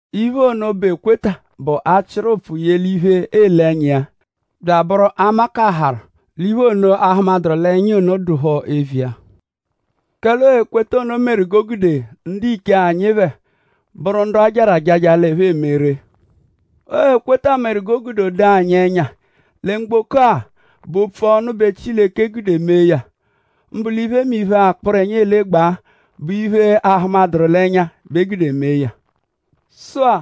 Iphe ono, bụ ekweta bụ: achịru ụpfu ye l'iphe, eele ẹnya iya; bya abụru amakaharu l'iphe ono, a hụmaduru l'ẹnya ono dụ phọ eviya. Kẹle ọo ekweta ono meru g'o gude ndiche anyi phẹ bụru ndu ajarụ àjájá l'ẹphe eme ree. Ọo ekweta meru g'o gude o doo anyi ẹnya lẹ mgboko-a bụ opfu ọnu bẹ Chileke gude mee ya; mbụ l'iphemiphe-a, akpụrenya elegbaa bụ iphe, aahụmaduru l'ẹnya bẹ e gude mee ya. Sụ-a;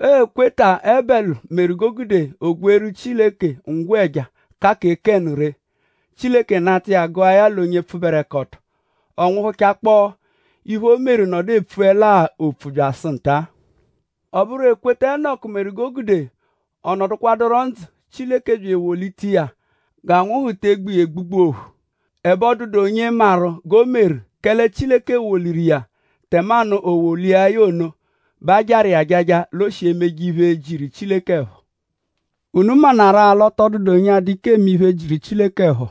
ọo ekweta Ebẹlu meru g'o gude o gweeru Chileke ngwẹja, ka kẹ Kénu ree. Chileke nata iya gụa ya l'onye pfụberekoto; ọ nwụhuchakpoo iphe, o meru nọdu epfuẹlaa opfu byasụ nta. Ọ bụru ekweta Inọku meru g'o gude ọ nọdukwaduro ndzụ; Chileke bya ewolita iya g'anwụhu te egbu iya egbugbu ophu; ẹbe ọ dụdu onye maru g'o meru; kẹle Chileke woliwaru iya; tẹmanu e wolia ya ono bẹ ajarụ iya ajaja l'o shi emeje iphe, jiru Chileke ẹpho. Unu maanarụ-a l'ọ tọ dụdu onye a-dụ ike eme iphe, jiru Chileke ẹpho;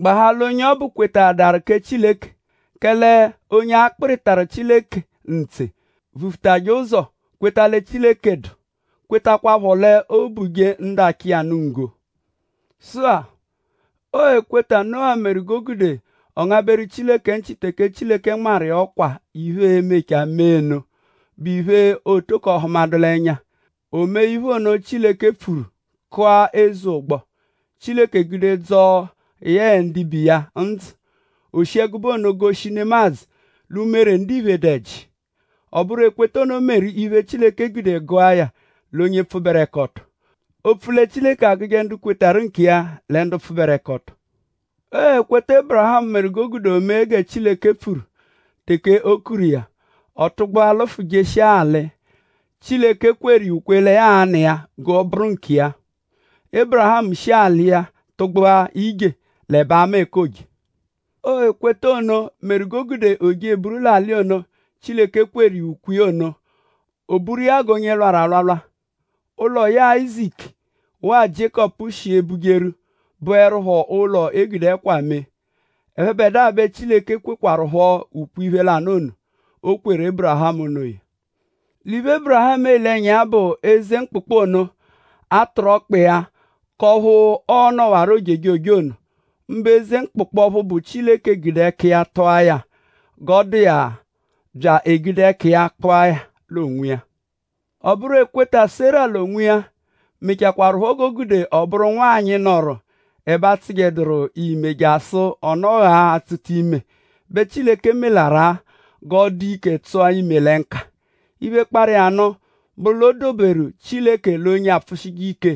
gbahaa l'onye ọbu kwetaadaru kẹ Chileke. Kẹle onye akpịritaru Chileke ntse vufutajẹ ụzo kweta lẹ Chileke dụ; kwetakwaphọ l'oo-buje ndu achọ iya nụ nggo. Sụ-a; ọo ekweta Nuwa meru g'o gude ọ ngabẹru Chileke nchị teke Chileke nmarụ iya ọkwa iphe, e-mechaa mee nụ, bụ iphe, ọ tọko hụmadu l'ẹnya. O mee iphe, Chileke pfuru; kụa eze ụgbo, Chileke gude dzọo yẹe ndibe iya ndzụ. O shi ẹgube ono goshi nemadzụ l'umere ndiphe dụ ẹji. Ọ bụru ekweta ono meru iphe, Chileke gude gụa ya l'onye pfụberekoto. Opfu lẹ Chileke agụje ndu kwetarụ nkiya lẹ ndu pfụberekoto. Ọo ekweta Ébirihamu meru g'o gude o mee gẹ Chileke pfuru teke o kuru iya. Ọ tụgbua lụfu jeshia alị, Chileke kweru iya ukwe lẹ ya a-nụ iya g'ọ bụru nkiya. Ébirihamu shi l'alị iya tụgbua ije; l'ẹbe ama ẹka ooje. Ọo ekweta ono meru g'o gude o je eburu l'alị ono, Chileke kweru iya ukwe iya ono. O buru iya g'onye lwarụ alwalwa. Ụlo, yẹe Áyizaku waa Jiékọpu shi ebujeru bụerupho ụlo, e gude ẹkwa mee. Ẹphebedua bẹ Chileke kwekwarụpho ukwe-iphe lanụ ono, o kweru Ébirihamu onoya. L'iphe Ébirihamu ele ẹnya iya bụ eze mkpụkpu ono, a tụru ọkpa iya; k'ọphu ọo-nọwaro ojejoje ono; mbụ eze mkpụkpu ọphu bụ Chileke gude ẹka iya tụa ya g'ọo-dụ bya egude ẹka iya kpụa ya l'onwiya. Ọ bụru ekweta Sera l'onwiya mechakwarụpho g'o gude ọ bụru nwanyị, nọru; ẹbe ọ tsụjeduru ime jasụ ọ nọghaa atsụta ime bẹ Chileke meẹluru-a g'ọ dụ ike tsụta ime lẹ nka. Iphe, kparụ iya nụ bụru l'o doberu Chileke l'onye apfụshije ike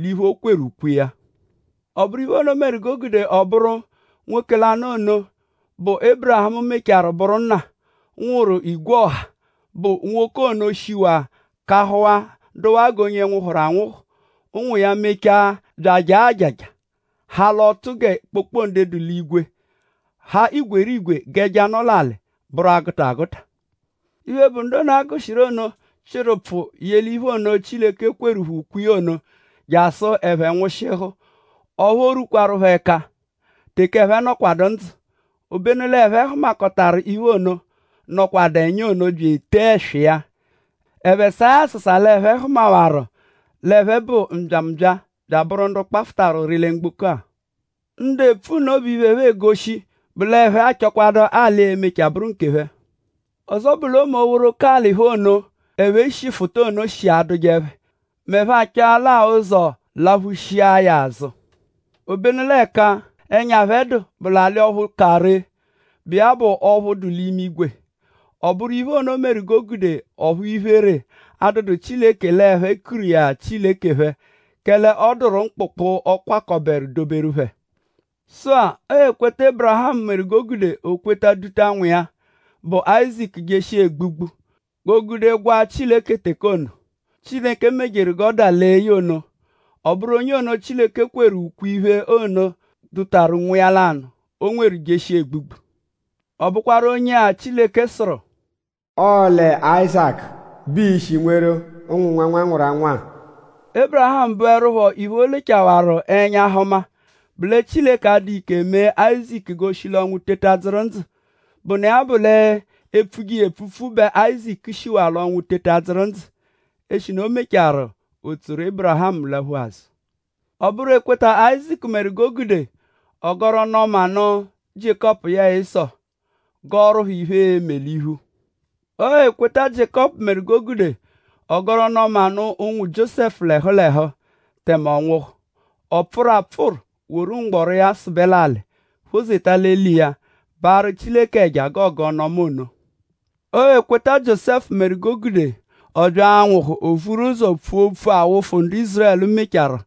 l'iphe, o kweru ukwe iya. Ọ bụru iphe ono meru g'o gude ọ bụru nwoke lanụ ono, bụ Ébirihamu mechaarụ bụru nna, nwụru igwe ọha; mbụ nwoke ono shiwaa kahụwaa dụwaa g'onye nwụhuru anwụhu. Ụnwu iya mechaa bya ajaa àjàjà; ha l'ọtu gẹ kpokpode dụ l'igwe; ha igwerigwe g'ẹja, nọ l'alị; bụru 'agụta agụta. Iphe, bụ ndu ono, a gụshiru ono chịru ụpfu ye l'iphe ono, Chileke kweru phẹ ukwe iya ono jasụ ẹphe nwụshihu; ọphu o rwukwaru phẹ ẹka teke ẹphe nọkwadu ndzụ. Obenu l'ẹphe hụmakotaru iphe ono, nọkwadu ẹnya ono bya etee ẹswa iya. Ẹphe saa ya asasa l'ẹphe hụmawaru l'ẹphe bụ mbyambya bya abụru ndu kpafụtaru ụri lẹ mgboko-a. Ndu epfu nno bụ iphe, ẹphe egoshi bụ l'ẹphe achọkwadu alị, e-mechaa bụru nkephẹ. Ọzo bụ l'ọme oghoroko alị phẹ ono, ẹphe shiru fụta ono shi adụje phẹ m'ẹphe achọle-a ụzo laphushia ya azụ. Obenu l'ẹka ẹnya dụ phẹ bụ l'alị ọphu ka ree, bụ iya bụ ọphu dụ l'imigwe. Ọ bụru iphe ono meru g'o gude ọphu iphere adụdu Chileke l'ẹphe kuru iya Chileke phẹ; kẹle ọ dụru mkpụkpu ọ kwakọberu doberu phẹ. Sụ-a; ọo ekweta Ébirihamu meru g'o gude o kweta duta nwa iya, bụ Áyizaku jeshia egbugbu g'o gude gwaa Chileke teke ono, Chileke mejeru gẹ ya dalee ya ono. Ọ bụru onye ono Chileke kweru ukwe-iphe ono dutaru nwa lanụ, o nweru jeshia egbugbu. Ọ bụkwaru onye-a Chileke sụru: “Ọo lẹ Áyizaku bẹ ii-shi nweru ụnwu nwanwanwaranwa-a.” Ébirihamu bụerupho iphe, o lechawaru ẹnya hụma bụ lẹ Chileke a-dụa ike mee Áyizaku g'o shi l'ọnwu teta dzụru ndzụ, bụnu iya bụ l'e -pfuje iya epfupfu bẹ Áyizaku shiwaa l'ọnwu teta dzụru ndzụ; eshinu e mechaarụ o tsoru Ébirihamu laphu azụ. Ọ bụru ekweta Áyizaku meru g'o gude ọ gọru ọnu-ọma nụ Jiékọpu yẹe Ịso; gọoru phẹ iphe, e-me l'iphu. Ọo ekweta Jiékọpu meru g'o gude ọ gọru ọnu-ọma nụ ụnwu Jiósẹfu l'ẹhu l'ẹhu tẹme ọ nwụhu. Ọ pfụru apfụru; woru mgbọro iya sụbe l'alị; phozeta l'eli iya; baarụ Chileke ẹja g'ọ gọ ọnu-ọma ono. Ọo ekweta Jiósẹfu meru g'o gude ọ bya l'anwụhu; o vuru ụzo pfua opfu awụfu, ndu Ízurẹlu mechaarụ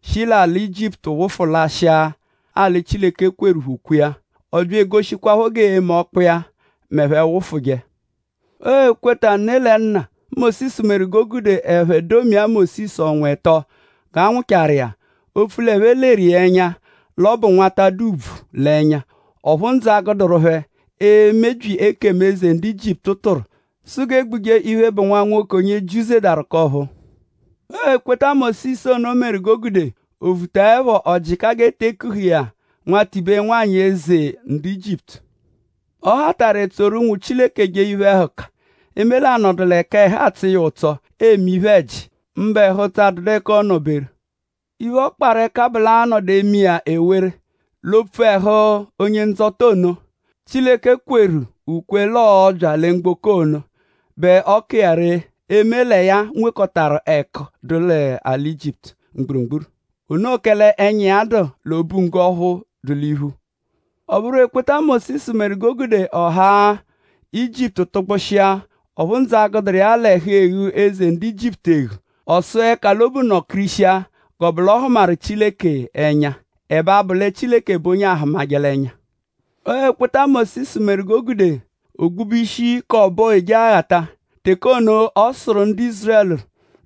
shi l'alị Ijiputu wụfu lashịa alị, Chileke kweru phẹ ukwe iya. Ọ bya egoshikwaphọ g'ee-me ọkpu iya m'ẹphe -wụfuje. Ọo ekweta ne lẹ nna Mósisu meru g'o gude ẹphe domia Mósisu ọnwa ẹto g'a nwụchaaru iya; opfu l'ẹphe leru iya ẹnya l'ọ bụ nwata, dụ ùbvù l'ẹnya; ọphu ndzụ agụeduru phẹ emebyi ekemu, eze ndu Ijiputu tụru sụ g'e gbuje iphe, bụ nwa nwoke, onye Jiu zedaru k'ọ̀phúú. Ọo ekweta Mósisu ono meru g'o gude o vutaẹpho; ọ jịka g'e te ekuhẹ iya nwatibe nwa nwanyị eze ndu Ijiputu. Ọ hatarụ etsoru ụnwu Chileke jee iphe-ẹhuka; eme l'anọdu l'ẹka ẹhu atsọ iya ụtso eme iphe-ẹji; mbụ ẹhu-ụtso, adụdu ẹka ọono-beru. Iphe, ọ kparụ ẹka bụ l'a -nọdu eme iya ewere l'opfu ẹhu Onye-Ndzọta ono, Chileke kweru ukwe iya l'ọo-bya lẹ mgboko ono bẹ ọ ka iya ree eme lẹ ya nwekọtaru ẹku, dụ l'alị Ijiputu mgburugburu. Onoo kẹle ẹnya dụ iya l'obunggo ọphu dụ l'iphu. Ọ bụru ekweta Mósisu meru g'o gude ọ haa Ijiputu tụgbushia; ọphu ndzụ agụduru iya l'ẹhu e-ghu eze ndu Ijiputu eghu. Ọ sụa ẹka l'obu nọ-kirishia g'ọ -bụ l'ọ hụmaru Chileke ẹnya; l'ẹbe abụ lẹ Chileke bụ onye aahụmaje l'ẹnya. Ọo ekweta Mósisu meru g'o gude o gbube ishi k'ọbo Ojeghata; teke ono, ọ sụru ndu Ízurẹlu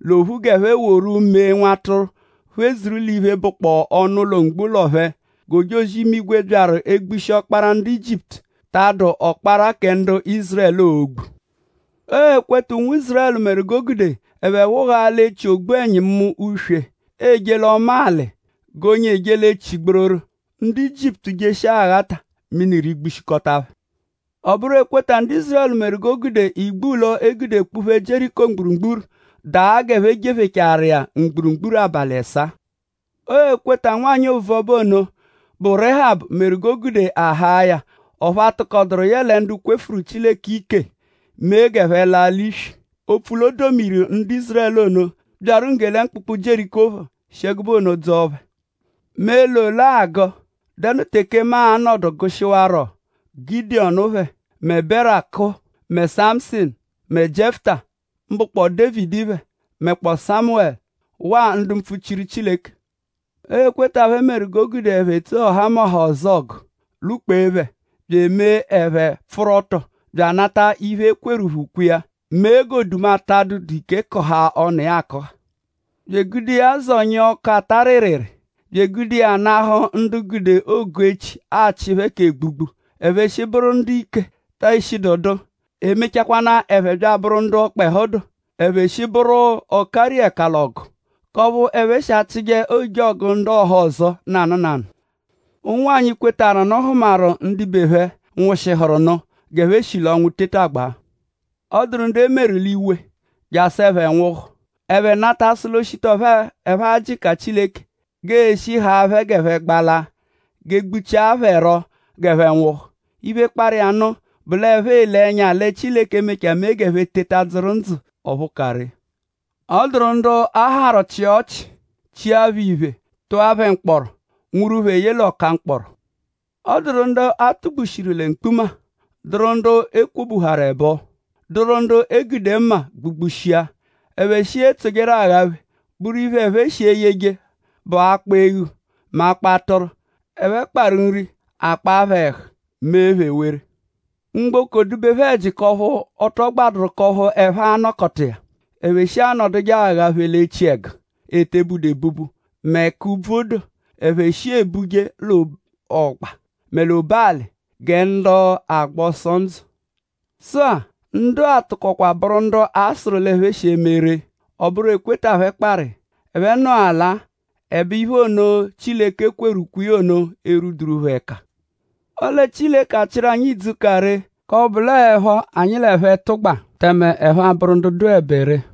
l'ophu g'ẹphe woru mee nwatụru phedzuru l'iphe, bụkpoo ọnu mgbo ụlo phẹ; g'ojozi-imigwe, byaru egbushi ọkpara ndu Ijiputu ta adụ ọkpara kẹ ndu Ízurẹlu, oo-gbu. Ọo ekweta ụnwu Ízurẹlu meru g'o gude ẹphe wụghaa l'echi ògbú Ẹnyimu-uswe eje l'ọma alị g'onye eje l'echi gbororo. Ndu Ijiputu jeshia aghata; mini rigbushikọta phẹ. Ọ bụru ekweta ndu Ízurẹlu meru g'o gude igbulọ, e gude kpuphee Jieriko mgburugburu daa g'ẹphe jephechaaru iya mgburugburu abalị ẹsaa. Ọo ekweta, nwanyị ovuọba ono, bụ Réhabu meru g'o gude a haa ya; ọphu a tụkoduru yẹe ndu kwefuru Chileke ike mee g'ẹphe laa l'iswi; opfu l'o domijeru ndu Ízurẹlu ono, byaru ngge lẹ mkpụkpu Jieriko phọ; shi ẹgube ono dzọo phẹ. ?Mu e-le ole agụ??Dẹnu teke mu a-nọdu gụshiwaro Gidiyọnu phẹ mẹ Beraku; mẹ Samụsinu; mẹ Jiẹfuta; mbụkpoo Dévidi phẹ; mẹkpoo Sámẹlu; waa ndu mpfuchiru Chileke. Ọo ekweta phẹ bẹ meru g'o gude ẹphe tsoo ọhamoha ọzo ọgu; lwụ-kpee phẹ; bya eme iphe, pfụru ọto; bya anata iphe, e kweru phẹ ukwe iya; mee g'oduma ta adụ ike kụhaa ọnu akụha; bya egude iya zọnyia ọku, ata rịriri; bya egude iya nahụ ndu gude ogu-echi achị phẹ k'egbugbu. Ẹphe shi bụru ndu ike te eshidu dụ; e mechakwanaa ẹphe bya abụru ndu ọkpehu dụ. Ẹphe shi bụru ọ-kariẹka l'ọgu; k'ọphu ẹphe shi achịje ojọgu ndu ọhozo nanụ nanụ. Ụnwanyi, kwetarụ nụ hụmaru ndibe phẹ, nwụshihuru nụ g'ẹphe shi l'ọnwu tetagbaa. Ọ dụru ndu e meru l'iwe jasụ ẹphe nwụhu. Ẹphe nata sụ l'o -shita ọphu ẹphe a-jịka Chileke g'e-shi g'a haa phẹ g'ẹphe gbalaa; g'e gbuchia phẹ rọ g'ẹphe nwụhu. Iphe, kparụ iya nụ bụ l'ẹphe ele ẹnya lẹ Chileke e-mechaa mee g'ẹphe teta dzụru ndzụ ọphu ka ree. Ọ dụru ndu a harụ chịa ọchi; chia phẹ iphe; tụa phẹ mkpọro; nwuru phẹ ye l'ọka mkpọro. Ọ dụru ndu a tugbushiru lẹ mkpuma; dụru ndu e kwobuharu ẹbo; dụru ndu e gude mma gbugbushia; ẹphe shi etsojeru aghapheẹpho; bụru iphe, ẹphe shi eyeje bụ akpọ eghu mẹ akpọ atụru. Ẹphe kparụ nri; a kpaa phẹ ẹhu; mee phẹ ewere. Mgboko dụ-be phẹ ẹji; k'ọphu ọ tọ gbadụru k'ọphu ẹphe a-nọkota iya. Ẹphe shi anọduje aghaphe l'echiẹgu, e te budu ebubu mẹ l'ẹka úbvú dụ; ẹphe shi ebuje l'ọgba mẹ l'obu-alị gẹ ndu agba ọso ndzụ. Sụ-a; ndu-a tụkokwaaru bụru ndu a sụru l'ẹphe shi eme ree. Ọ bụru ekweta phẹ kparụ iya. Ẹphe nọelaa; ẹbe iphe ono, Chileke kweru ukwe iya ono erwuduru phẹ ẹka. Ọle Chileke achịru anyi idzu, ka ree; k'ọphu bụ l'ọoepho anyi l'ẹphe -tụgba; tẹme ẹphe a-bụru ndu dụebe ree.